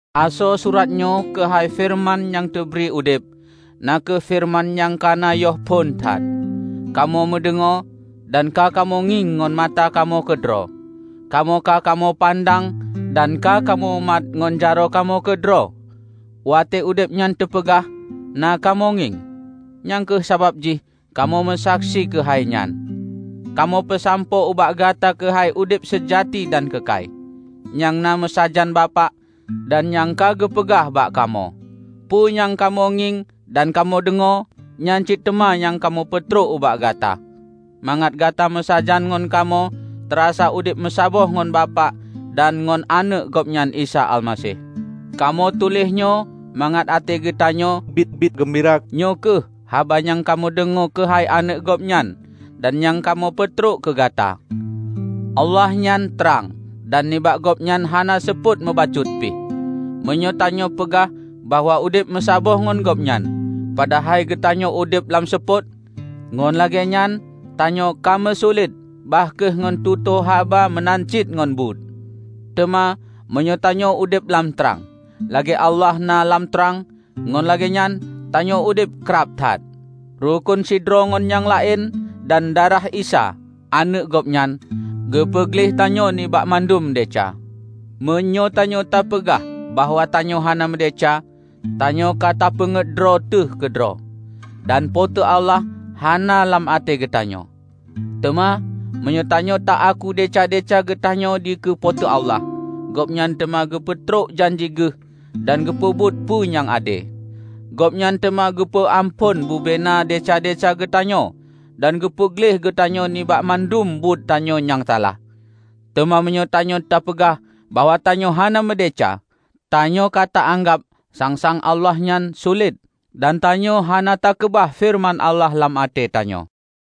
Asoe surat nyoe keuhai Feureuman nyang teubri udeb, na kheueh Feureuman nyang ka na yoh phon that. Kamoe meudeungoe, dan ka kamoe ngieng ngon mata kamoe keudroe. Kamoe ka kamoe pandang, dan ka kamoemat ngon jaroe kamoe keudroe. Watée udeb nyan teupeugah, na kamoe ngieng. Nyang kheueh sabab jih kamoe meusaksi keuhai nyan. Kamoe peusampoe ubak gata keuhai udeb seujati dan keukai, nyang na meusajan Bapak, dan nyang ka geupeugah bak kamoe. Peue nyang ka kamoe ngieng dan kamoe deungoe, nyan cit teuma nyang kamoe peutrok ubak gata, mangat gata meusajan ngon kamoe tarasa udeb meusaboh ngon Bapak dan ngon Aneuëk Gobnyan Isa Almaseh. Kamoe tuléh nyoe mangat até geutanyoe biet-biet geumbira. Nyoe kheueh haba nyang kamoe deungoe keuhai Aneuëk Gobnyan dan nyang kamoe peutrok keugata: Allah nyan trang, dan nibak Gobnyan hana seupôt meubacut pih. Meunyoe tanyoe peugah bahwa udeb meusaboh ngon Gobnyan, padahai geutanyoe udeb lam seupôt, ngon lagée nyan tanyoe kameusulet bah kheueh ngon tutoe haba meunan cit ngon buet. Teuma meunyoe tanyoe udeb lam trang, lagée Allah na lam trang, ngon lagée nyan tanyoe udeb krab that, rukon sidroe ngon nyang laén, dan darah Isa, Aneuëk Gobnyan, geupeu gleh tanyoe nibak mandum desya. Meunyoe tanyoe tapeugah bahwa tanyoe hana meudesya, tanyoe ka tapeunget droe teuh keudroe; dan Po teu Allah hana lam até geutanyoe. Teuma meunyoe tanyoe ta-aku desya-desya geutanyoe dikeue Po teu Allah, Gobnyan teuma geupeutrok janji Geuh dan geupeubuet peue nyang ade. Gobnyan teuma geupeu amphon bubena desya-desya geutanyoe dan geupeu gleh geutanyoe nibak mandum buet tanyoe nyang salah. Teuma meunyoe tanyoe tapeugah bahwa tanyoe hana meudesya, tanyoe ka ta-anggab sang-sang Allah nyan sulet dan tanyoe hana takeubah feureuman Allah lam até tanyoe.